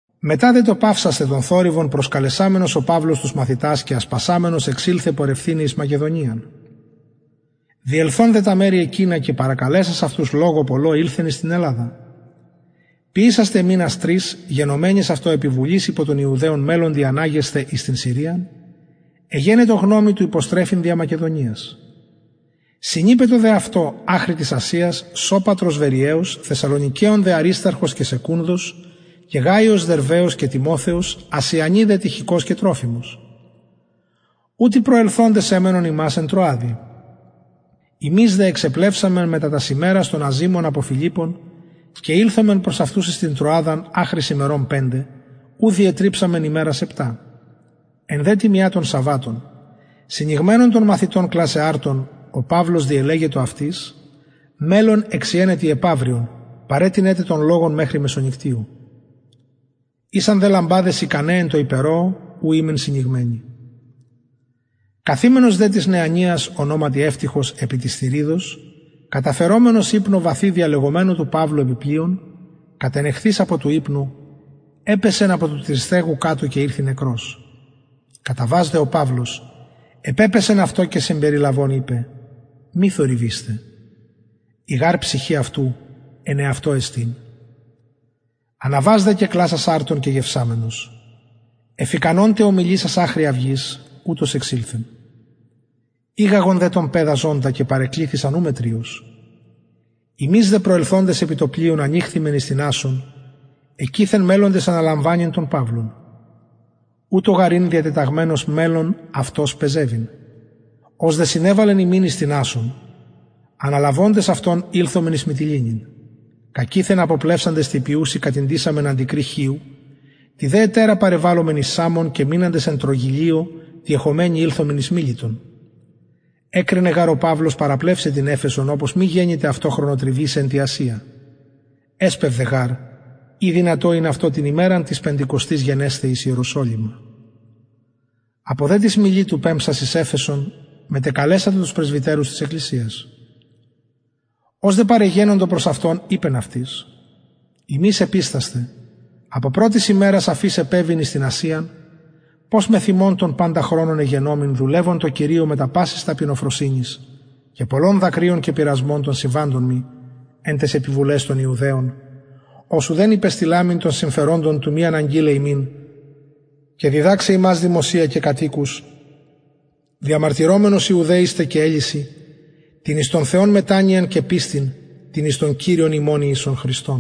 μετα δε το παυσασθαι τον θορυβον προσκαλεσαμενος ο παυλος τους μαθητας και ασπασαμενος εξηλθεν πορευθηναι εις την μακεδονιαν διελθων δε τα μερη εκεινα και παρακαλεσας αυτους λογω πολλω ηλθεν εις την ελλαδα ποιησας τε μηνας τρεις γενομενης αυτω επιβουλης υπο των ιουδαιων μελλοντι αναγεσθαι εις την συριαν εγενετο γνωμη του υποστρεφειν δια μακεδονιας συνειπετο δε αυτω αχρι της ασιας σωπατρος βεροιαιος θεσσαλονικεων δε αρισταρχος και σεκουνδος και γαιος δερβαιος και τιμοθεος ασιανοι δε τυχικος και τροφιμος ουτοι προσελθοντες εμενον ημας εν τρωαδι ημεις δε εξεπλευσαμεν μετα τας ημερας των αζυμων απο φιλιππων και ηλθομεν προς αυτους εις την τρωαδα αχρι ημερων πεντε ου διετριψαμεν ημερας επτα εν δε τη μια των σαββατων συνηγμενων των μαθητων κλασαι αρτον ο παυλος διελεγετο αυτοις μελλων εξιεναι τη επαυριον παρετεινεν τε τον λογον μεχρι μεσονυκτιου ησαν δε λαμπαδες ικαναι εν τω υπερωω ου ημεν συνηγμενοι καθημενος δε τις νεανιας ονοματι ευτυχος επι της θυριδος καταφερομενος υπνω βαθει διαλεγομενου του παυλου επι πλειον κατενεχθεις απο του υπνου επεσεν απο του τριστεγου κατω και ηρθη νεκρος καταβας δε ο παυλος επεπεσεν αυτω και συμπεριλαβων ειπεν μη θορυβεισθε η γαρ ψυχη αυτου εν αυτω εστιν αναβας δε και κλασας αρτον και γευσαμενος εφ ικανον τε ομιλησας αχρι αυγης ουτως εξηλθεν ηγαγον δε τον παιδα ζωντα και παρεκληθησαν ου μετριως ημεις δε προσελθοντες επι το πλοιον ανηχθημεν εις την ασσον εκειθεν μελλοντες αναλαμβανειν τον παυλον ουτως γαρ ην διατεταγμενος μελλων αυτος πεζευειν ως δε συνεβαλεν ημιν εις την ασσον αναλαβοντες αυτον ηλθομεν εις μιτυληνην κακειθεν αποπλευσαντες τη επιουση κατηντησαμεν αντικρυ χιου τη δε ετερα παρεβαλομεν εις σαμον και μειναντες εν τρωγυλλιω τη εχομενη ηλθομεν εις μιλητον εκρινεν γαρ ο παυλος παραπλευσαι την εφεσον οπως μη γενηται αυτω χρονοτριβησαι εν τη ασια εσπευδεν γαρ ει δυνατον ην αυτω την ημεραν της πεντηκοστης γενεσθαι εις ιεροσολυμα απο δε της μιλητου πεμψας εις εφεσον μετεκαλεσατο τους πρεσβυτερους της εκκλησιας ως δε παρεγενοντο προς αυτον ειπεν αυτοις υμεις επιστασθε απο πρωτης ημερας αφ ης επεβην εις την ασιαν πως μεθ υμων τον παντα χρονον εγενομην δουλευων τω κυριω μετα πασης ταπεινοφροσυνης και πολλων δακρυων και πειρασμων των συμβαντων μοι εν ταις επιβουλαις των ιουδαιων ως ουδεν υπεστειλαμην των συμφεροντων του μη αναγγειλαι υμιν και διδαξαι υμας δημοσια και κατ οικους διαμαρτυρομενος ιουδαιοις τε και ελλησιν την εις τον θεον μετανοιαν και πιστιν την εις τον κυριον ημων ιησουν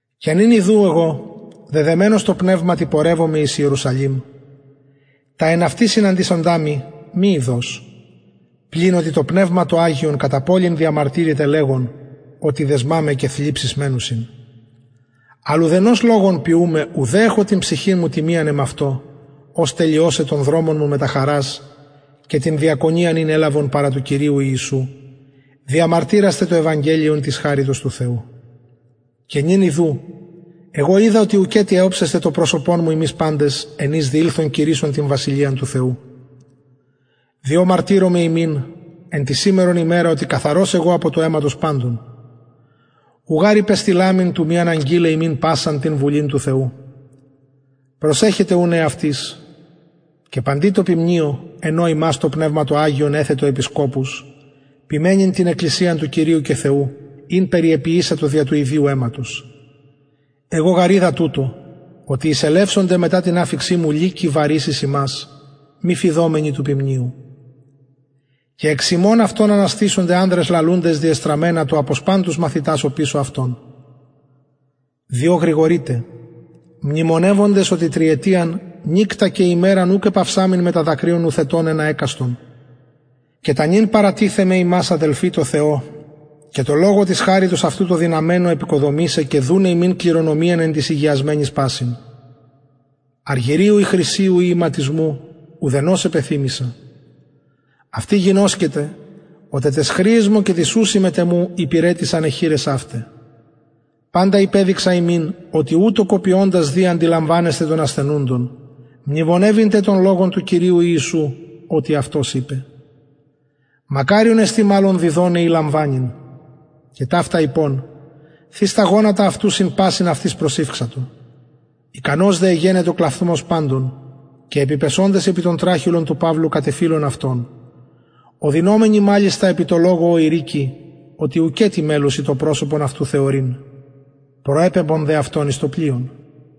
και νυν ιδου εγω δεδεμενος τω πνευματι πορευομαι εις ιερουσαλημ τα εν αυτη συναντησοντα μοι μη ειδως πλην οτι το πνευμα το αγιον κατα πολιν διαμαρτυρεται λεγον οτι δεσμα με και θλιψεις μενουσιν αλλ ουδενος λογον ποιουμαι ουδε εχω την ψυχην μου τιμιαν εμαυτω ως τελειωσαι τον δρομον μου μετα χαρας και την διακονιαν ην ελαβον παρα του κυριου ιησου διαμαρτυρασθαι το ευαγγελιον της χαριτος του θεου και νυν ιδου εγω οιδα οτι ουκετι οψεσθε το προσωπον μου υμεις παντες εν οις διηλθον κηρυσσων την βασιλειαν του θεου διοτι μαρτυρομαι υμιν εν τη σημερον ημερα οτι καθαρος εγω απο του αιματος παντων ου γαρ υπεστειλαμην του μη αναγγειλαι υμιν πασαν την βουλην του θεου προσεχετε ουν εαυτοις και παντι τω ποιμνιω εν ω υμας το πνευμα το αγιον εθετο επισκοπους ποιμαινειν την εκκλησιαν του κυριου και θεου ην περιεποιησατο δια του ιδιου αιματος εγω γαρ οιδα τουτο οτι εισελευσονται μετα την αφιξιν μου λυκοι βαρεις εις υμας μη φειδομενοι του ποιμνιου και εξ υμων αυτων αναστησονται ανδρες λαλουντες διεστραμμενα του αποσπαν τους μαθητας οπισω αυτων διο γρηγορειτε μνημονευοντες οτι τριετιαν νυκτα και ημεραν ουκ επαυσαμην μετα δακρυων νουθετων ενα εκαστον και τα νυν παρατιθεμαι υμας αδελφοι τω θεω και τω λογω της χαριτος αυτου τω δυναμενω εποικοδομησαι και δουναι υμιν κληρονομιαν εν τοις ηγιασμενοις πασιν αργυριου η χρυσιου η ιματισμου ουδενος επεθυμησα αυτοι γινωσκετε οτι ταις χρειαις μου και τοις ουσιν μετ εμου υπηρετησαν αι χειρες αυται παντα υπεδειξα υμιν οτι ουτως κοπιωντας δει αντιλαμβανεσθαι των ασθενουντων μνημονευειν τε των λογων του κυριου ιησου οτι αυτος ειπεν μακαριον εστιν μαλλον διδοναι η λαμβανειν και ταυτα ειπων θεις τα γονατα αυτου συν πασιν αυτοις προσηυξατο ικανος δε εγενετο κλαυθμος παντων και επιπεσοντες επι τον τραχηλον του παυλου κατεφιλουν αυτον οδυνωμενοι μαλιστα επι τω λογω ω ειρηκει οτι ουκετι μελλουσιν το προσωπον αυτου θεωρειν προεπεμπον δε αυτον εις το πλοιον